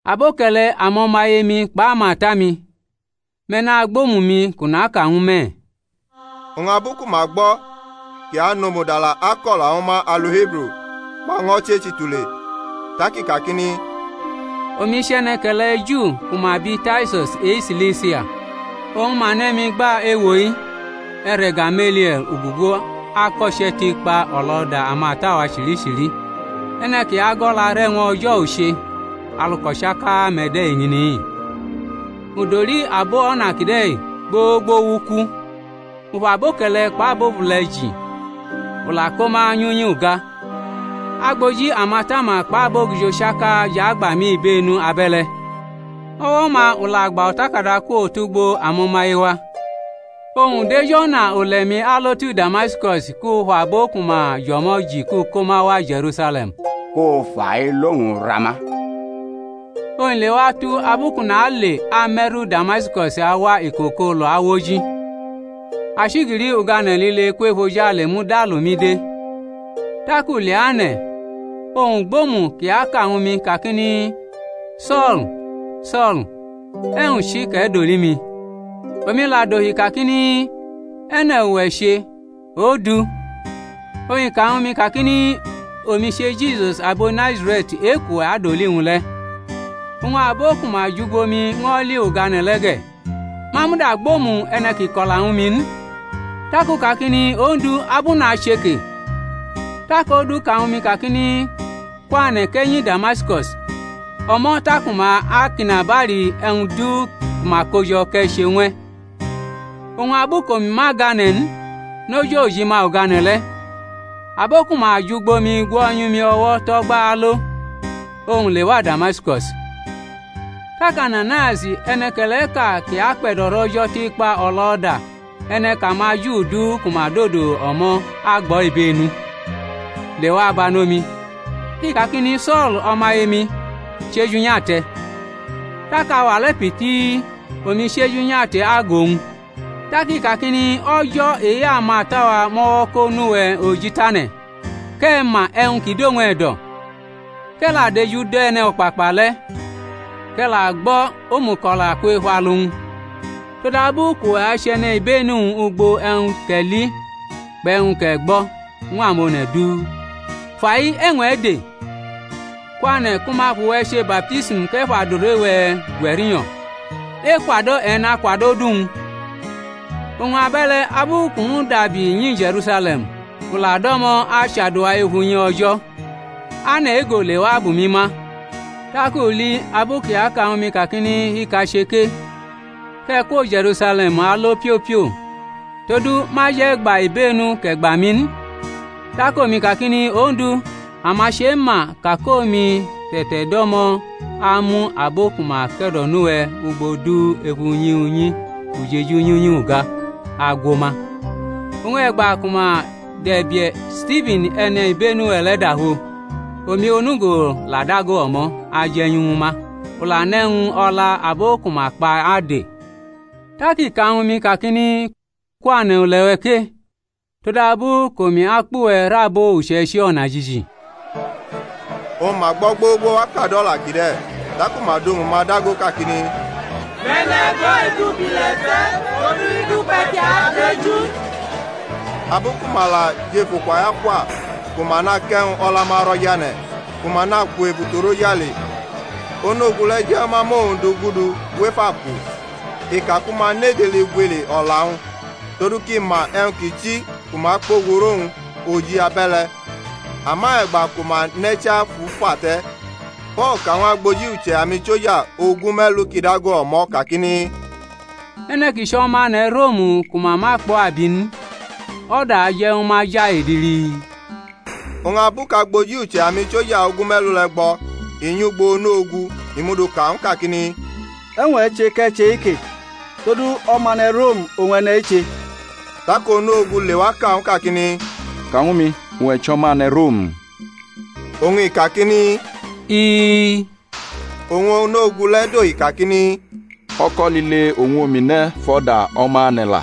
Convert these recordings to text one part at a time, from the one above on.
Aboke̩le̩ amo̩maye-mi kpʼamata-mi, me̩ nagbʼomu-mi kʼu naka ñw me̩. Oñ abu ku ma gbo kʼi anʼomu dala ako̩la ñw ma alu Hibru, ma ño̩ chechi tule. Tak i kakini: Omi chʼe̩ne̩ke̩le̩ Ju ku ma bi Tarsus e-Silisia, oñ ma ne̩ mi gba ewo-i, e̩re̩ Gamelie̩l, u gugu ako̩che̩ tikpa o̩lo̩da amata-wa chichili; e̩ne̩ kʼi ago̩larʼe̩wñ O̩jo̩ u che, alu kʼo̩chaka-me̩ de eñini-i. U doli abo O̩na kide̩ gbogbo wʼuku, u fʼaboke̩le̩ kpʼabobule̩ ji, u la ko ma nyʼunyi uga; agboji amatama kpʼabogijo chaka jʼagba mi ibenu abe̩le̩; o̩wo̩-ma u la gbʼo̩takada kwo tʼugbo amo̩maye-wa, oñ u dʼej o̩na ule̩-mi alo tu Damaskus kʼu fʼabo ku ma jʼo̩mo̩ ji kʼu ko ma wa Je̩rusale̩m, ku ma fʼailo-wñ ra ma. Oñ i lewatu abu kʼu nale ame̩ru Damaskus awa iko kʼolu awʼoji, achigili ugane̩ lile kwʼefojale muda lʼumi de. Tak u leane̩, oñ u gbʼomu kʼi aka ñw mi kakini, So̩l, So̩l, e̩wñ chi kʼe̩ doli mi? Omi la dohi kakini, E̩ne̩ uwe̩ che, Ondu? Oñ i ka ñw mi kakini, Omi che Jisus abo Nazare̩t e-kʼuwe̩ adoli-wñ le. Oñ abo ku ma jʼugbo mi ño̩ li ugane̩ le̩ ge̩, ma muda gbʼomu e̩ne̩ kʼi ko̩la ñw mi n. Tak u kakini, Ondu, abʼu nache ke? Tak Ondu ka ñw mi kakini, Kwane̩, kʼe̩ nyi Damaskus; o̩mo̩ taku ma akʼinabali e̩wñ du ku ma kojo̩ kʼe̩ che ñw e̩. Oñ abu kʼomi ma gane̩ n noj ojima ugane̩ le̩, abo ku ma jʼugbo mi gwo̩nyʼumi o̩wo̩ tʼo̩gba alo, oñ u lewa Damaskus. Tak Ananaius, e̩ne̩ke̩le̩ʼka kʼi akpe̩do̩rʼO̩jo̩ tikpa o̩lo̩da, e̩ne̩ kʼamaJu du ku ma dodo o̩mo̩ agbʼo̩ ibenu, lewa banʼomi, i kakini, So̩l, o̩maye-mi, chʼeju nyʼate̩. Tak auwa le̩ pitii omi chʼeju nyʼate̩ agʼowñ. Tak i kakini, O̩jo̩ e-amata-wa mʼo̩wo̩ ko nʼuwe̩ oji tane̩ kʼe̩ ma e̩wñ ki dʼowñ e̩do̩, kʼe̩ la dʼeju dʼE̩no̩kpakpa le̩, kʼe̩ la gbo̩ omuko̩la kwʼef alu-wñ; todabu kʼuwe̩ achʼe̩nibenu-wñ ugbo e̩wñ kʼe̩ li kpʼe̩wñ kʼe̩ gbo̩ ñw amone̩ du. Fai e̩wñ e̩ de? Kwane̩ ku ma fʼuwe̩ che baptism, kʼe̩ fʼadure-we̩ gwe̩ rinyo̩, ekwado̩ e̩ nakwadʼodu-wñ. Oñ abe̩le̩ abu kʼu mudabi nyi Je̩rusale̩m, kʼu la do̩mo̩ achadua ef unyi O̩jo̩, ane̩ ego lewa bʼumi ma, tak u li abu kʼi aka ñw mi kakini, Hika che ke, kʼe̩ kwo Je̩rusale̩m alo piopio, todu ma je̩ gba ibenu kʼe̩ gba mi n. Tak omi kakini, Ondu, ama chema ka kʼomi te̩te̩do̩mo amu abo ku ma ke̩do̩nʼuwe̩ ugbo du ef unyi unyi ujeju nyʼunyi uga agwo ma; oñ e̩gba ku ma dʼe̩bie̩ Stifan e̩nibenu-we̩ le̩ dafo, omi onugo la dago o̩mo̩ aje̩nyu ñw ma, u la nʼe̩wñ o̩la abo ku ma kpa ade. Tak i ka ñw mi kakini, Kwane̩ ule̩-we̩ ke, todabu kʼomi akpʼuwe̩ rʼabo uche̩ichi o̩najiji. Oñ ma gbʼo̩ gbogbo wa kadʼo̩la kide̩, taku ma dʼomu-ma dago kakini, Mʼe̩ne̩ e̩go̩-i du bʼile̩ te̩! todu i dukpe̩ kʼi adeju n. Abu ku ma la jʼef ukwa-i akwa, ku ma nakʼe̩wñ o̩la-ma ro̩ jʼane̩, ku ma nakwu ebutu rʼojale, onu-ogu le̩ je̩ ñw ma rnʼowñ du gudu wʼef aku, i ka ku ma nʼedili gwili o̩la-wñ, todu kʼi ma e̩wñ ki chi ku ma kpogu rʼowñ oji abe̩le̩. Ama e̩gba ku ma nʼe̩cha fʼu fa le̩, Po̩l ka ñw agboji uche̩ amisoja ogume̩lu kʼi dago o̩mo̩ kakini, E̩ne̩ ki chʼo̩mane̩ Rom ku ma ma kpʼo̩ abi n, o̩da aje̩ ñw ma ja edili? Oñ abu kʼagboji uche̩ amisoja ogume̩lu le̩ gbo i nyʼugbo onu-ogu i muduka ñw u kakini, E̩wñ e̩ che̩ kʼe̩ che-ike? Todu omane̩ Rom oñ e̩ne̩-i che. Tak onu-ogu lewa ka ñw u kakini, Ka ñw mi, uwe̩ chʼo̩mane̩ Rom? Oñ i kakini, Ii. Oñ onu-ogu le̩ dohi kakini, O̩ko̩ lile oñ omi ne̩ fʼo̩da o̩mane̩ la.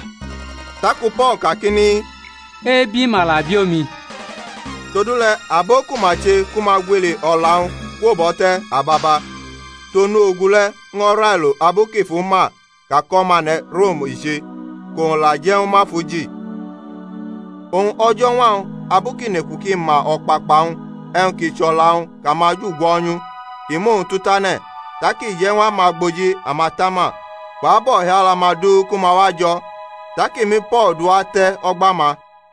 Taku Po̩l kakini, Ebi ma la bi omi. Todule̩ abo ku ma che ku ma gwiii o̩la-wñ kwobʼo̩ te̩ ababa, tʼonu ogu le̩ ño̩ railo abu kʼi fʼu ma ka kʼo̩mane̩ Rom i che, kʼowñ la je̩ ñw ma fʼu ji. Oñ o̩jo̩ñwa-wñ abu kʼi neku kʼi ma o̩kpakpa-wñ e̩wñ ki chʼo̩la-wñ kʼamaju gwo̩nyʼu, i mʼowñ tu tane̩, tak i je̩ ñw amagboji amatama kpʼabo o̩hiala-ma du ku ma wajo̩, tak i mu Po̩l duwa ate̩ o̩gba-ma.